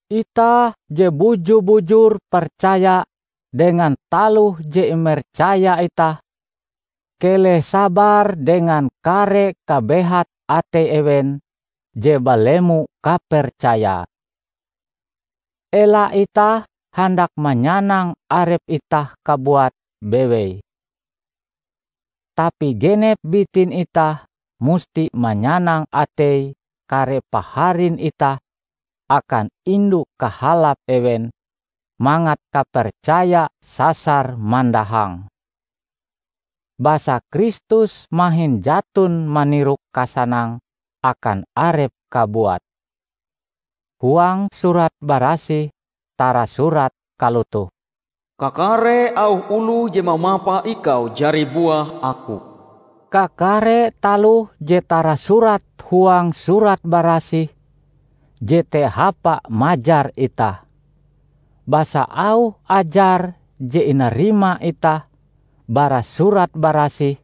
Itah je buju-bujur percaya dengan taloh je imercaya itah, keleh sabar dengan kare kabehat atei ewen je balemo kapercayae. Ela itah handak manyanang arep itah kabuat bewei. Tapi genep bitin itah musti manyanang atei kare paharin itah akan indu kahalap ewen, mangat kapercaya sasar mandahang. Basa Kristus mahin jaton manirok kasanang akan arepe kabuat. Huang Surat Barasih tarasurat kalotoh, "Kakare auh oloh je mamapa Ikau jari buah aku." Kakare taloh je tarasurat huang Surat Barasih jete hapa majar itah. Basa auh ajar je inarima itah bara Surat Barasih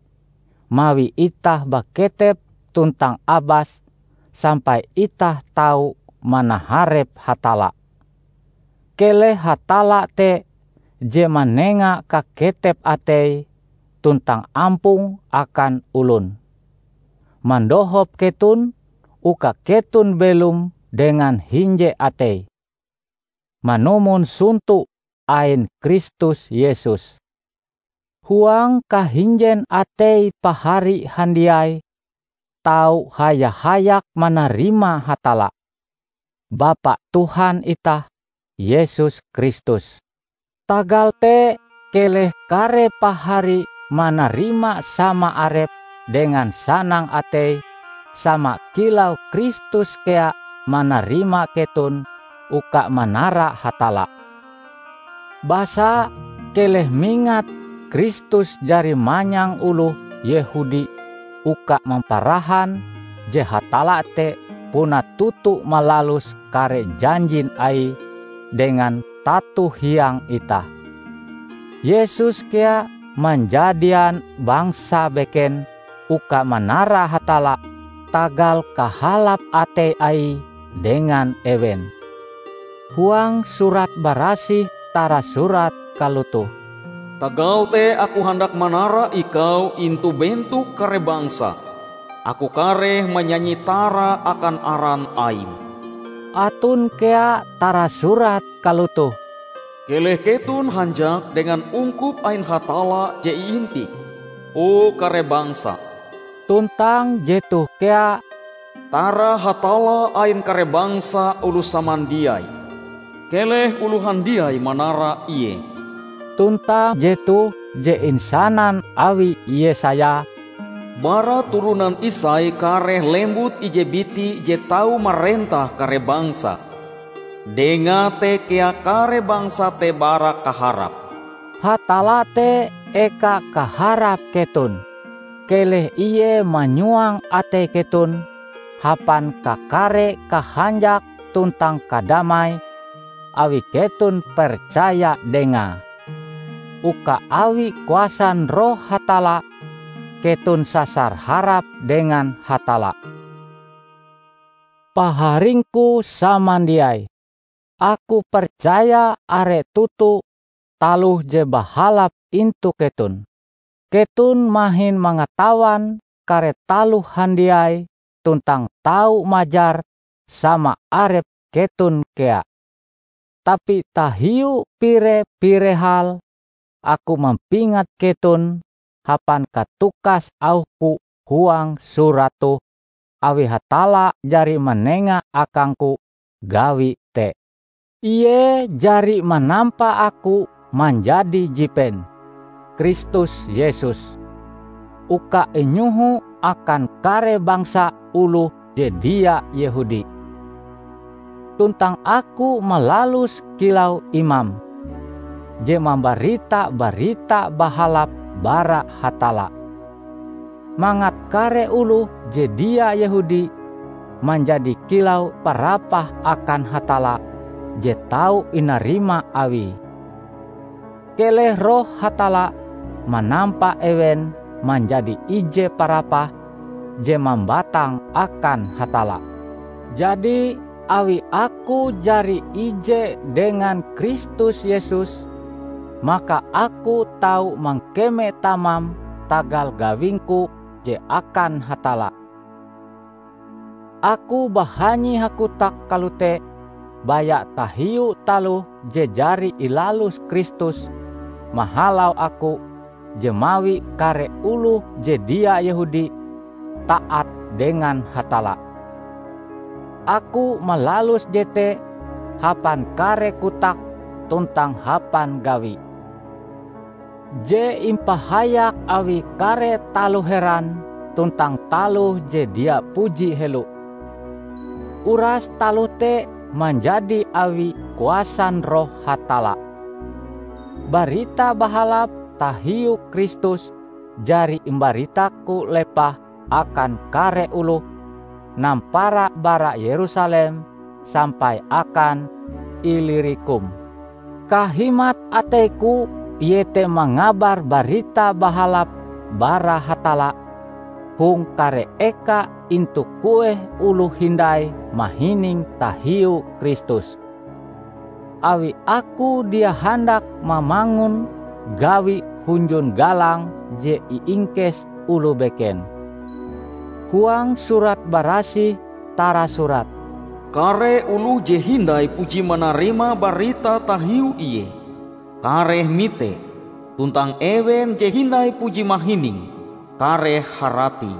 mawi itah baketep tuntang abas sampai itah tau manaharep Hatalla. Keleh Hatalla te je manenga kaketep atei tuntang ampong akan olon, mandohop keton uka keton belom dengan hinje atei, manumon sonto ain Kristus Yesus. Huang kahinjen atei pahari handiai tau haya-hayak manarima Hatalla, Bapa Tuhan itah Yesus Kristus. Tagal te keleh kare pahari manarima sama arep dengan sanang atei sama kilau Kristus kea manarima keton uka manara Hatalla. Basa, keleh mingat, Kristus jari manyang oloh Yehudi uka mamparahan je Hatalla te puna toto malalus kare janjin Aie dengan tato hiang itah. Yesus kea manjadian bangsa beken uka manara Hatalla tagal kahalap atei Aie dengan ewen. Huang Surat Barasih tarasurat kalotoh, "Tagal te aku handak manara Ikau intu bentok kare bangsa, aku kareh manyanyi tara akan aran Aim." Aton kea tarasurat kalotoh, "Keleh keton hanjak dengan ungkup ain Hatalla je iintih, o kare bangsa!" Tuntang jetoh kea, "Tara Hatalla ain kare bangsa oloh samandiai, keleh oloh handiai manara Ie!" Tuntang jetoh je insanan awi Yesaya, "Bara turonan Isai kareh lembut ije biti je tau marentah kare bangsa; Dengae te kea kare bangsa te bara kaharap." Hatalla te eka kaharap keton. Keleh Ie manyuang atei keton hapan kakare kahanjak tuntang kadamai awi keton percaya Dengae, uka awi kuasan Roh Hatalla keton sasar harap dengan Hatalla. Paharingku samandiai! Aku percaya are toto taloh je bahalap intu keton. Keton mahin mangatawan kare taloh handiai tuntang tau majar sama arep keton kea. Tapi tahiu pire-pire hal, aku mampingat keton hapan katukas auhku huang surat toh, awi Hatalla jari manenga akangku gawi te. Ie jari manampa aku manjadi jipen Kristus Yesus uka inyoho akan kare bangsa oloh je dia Yehudi. Tuntang aku malaluse kilau imam, je mambarita Barita Bahalap bara Hatalla, mangat kare oloh je dia Yehudi manjadi kilau parapah akan Hatalla je tau inarima Awie. Keleh Roh Hatalla manampa ewen manjadi ije parapah je mambatang akan Hatalla. Jadi, awi aku jari ije dengan Kristus Yesus, maka aku tau mangkeme tamam tagal gawingku je akan Hatalla. Aku bahanyi hakotak kalote baya tahiu taloh je jari ilalus Kristus mahalau aku je mawi kare oloh je dia Yehudi taat dengan Hatalla. Aku malalus jete hapan kare kotak tuntang hapan gawi, je impahayak awi kare taloh heran tuntang taloh je dia puji helo; uras taloh te manjadi awi kuasan Roh Hatalla. Barita Bahalap tahiu Kristus jari imbaritaku lepah akan kare oloh, nampara bara Yerusalem sampai akan Ilirikum. Kahimat ateiku iete mangabar Barita Bahalap bara Hatalla hong kare eka intu kueh oloh hindai mahining tahiu Kristus. Awi aku dia handak mamangun gawi hunjun galang je iingkes oloh beken. Huang Surat Barasih tarasurat, "Kare oloh je hindai puji manarima barita tahiu Ie, kareh mite; tuntang ewen je hindai puji mahining, kareh harati."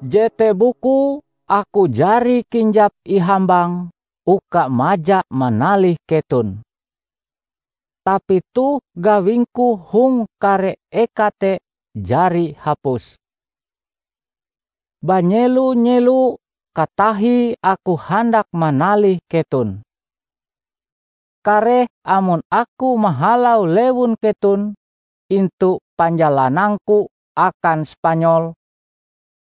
Jete bukue aku jari kinjap ihambang uka maja manalih keton. Tapi toh gawingku hong kare eka te jari hapus. Banyelo-nyelo katahie aku handak manalih keton. Kareh amon aku mahalau lewun keton intu panjalanangku akan Spanyol,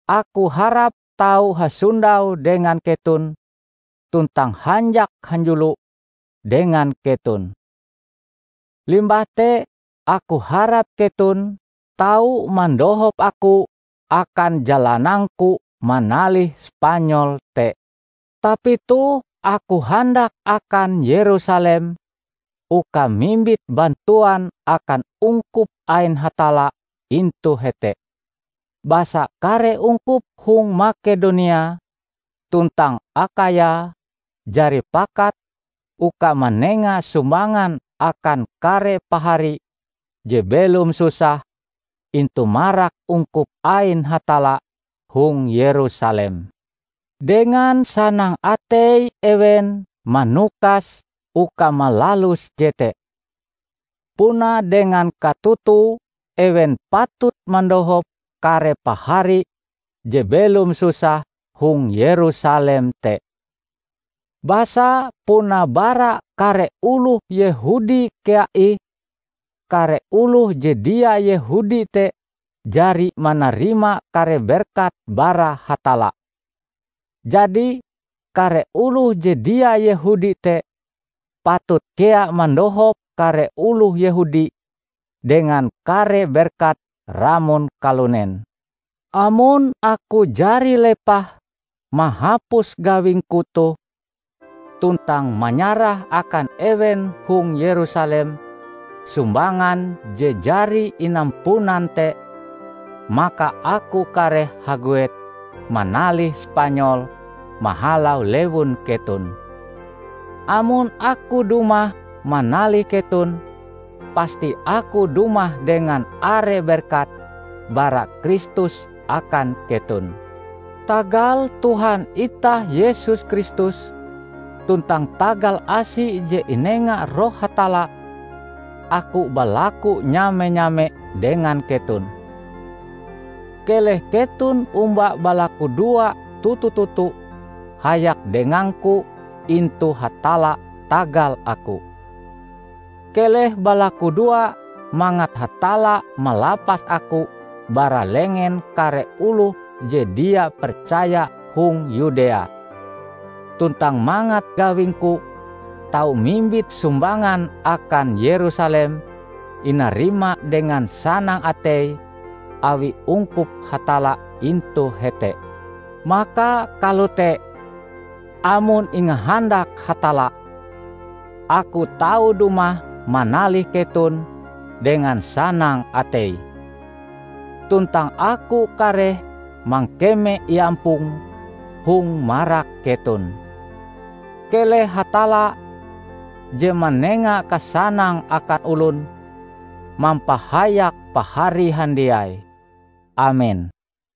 aku harap tau hasondau dengan keton tuntang hanjak hanjulo dengan keton. Limbah te aku harap keton tau mandohop aku akan jalanangku manalih Spanyol te. Tapi toh aku handak akan Yerusalem uka mimbit bantuan akan ungkup ain Hatalla intu hete. Basa kare ungkup hong Makedonia tuntang Akhaya jari pakat uka manenga sumbangan akan kare pahari je belom susah intu marak ungkup ain Hatalla hong Yerusalem. Dengan sanang atei ewen manukas uka malalus jete. Puna dengan katotoe ewen patut mandohop kare pahari je belom susah hong Yerusalem te; basa puna bara kare oloh Yehudi kea ih kare oloh je dia Yehudi te jari manarima kare berkat bara Hatalla. Jadi, kare oloh je dia Yehudi te patut kea mandohop kare oloh Yehudi dengan kare berkat ramon kalunen. Amon aku jari lepah mahapus gawingku toh, tuntang manyarah akan ewen hong Yerusalem sumbangan je jari inampunan te, maka aku kareh haguet manalih Spanyol mahalau lewun keton. Amon aku dumah manalih keton, pasti aku dumah dengan are berkat bara Kristus akan keton. Tagal Tuhan itah Yesus Kristus, tuntang tagal asi je inenga Roh Hatalla, aku balaku nyame-nyame dengan keton, keleh keton omba balakudoa toto-toto hayak dengangku intu Hatalla tagal aku. Keleh balakudoa mangat Hatalla malapas aku bara lengen kare oloh je dia percaya hong Yudea, tuntang mangat gawingku tau mimbit sumbangan akan Yerusalem inarima dengan sanang atei awi ungkup Hatalla intu hete. Maka kalote, amon ingahandak Hatalla, aku tau dumah manalih keton dengan sanang atei. Tuntang aku kareh mangkeme iampong hong marak keton. Keleh Hatalla, je manenga kasanang akan olon, mampahayak pahari handiai. Amen.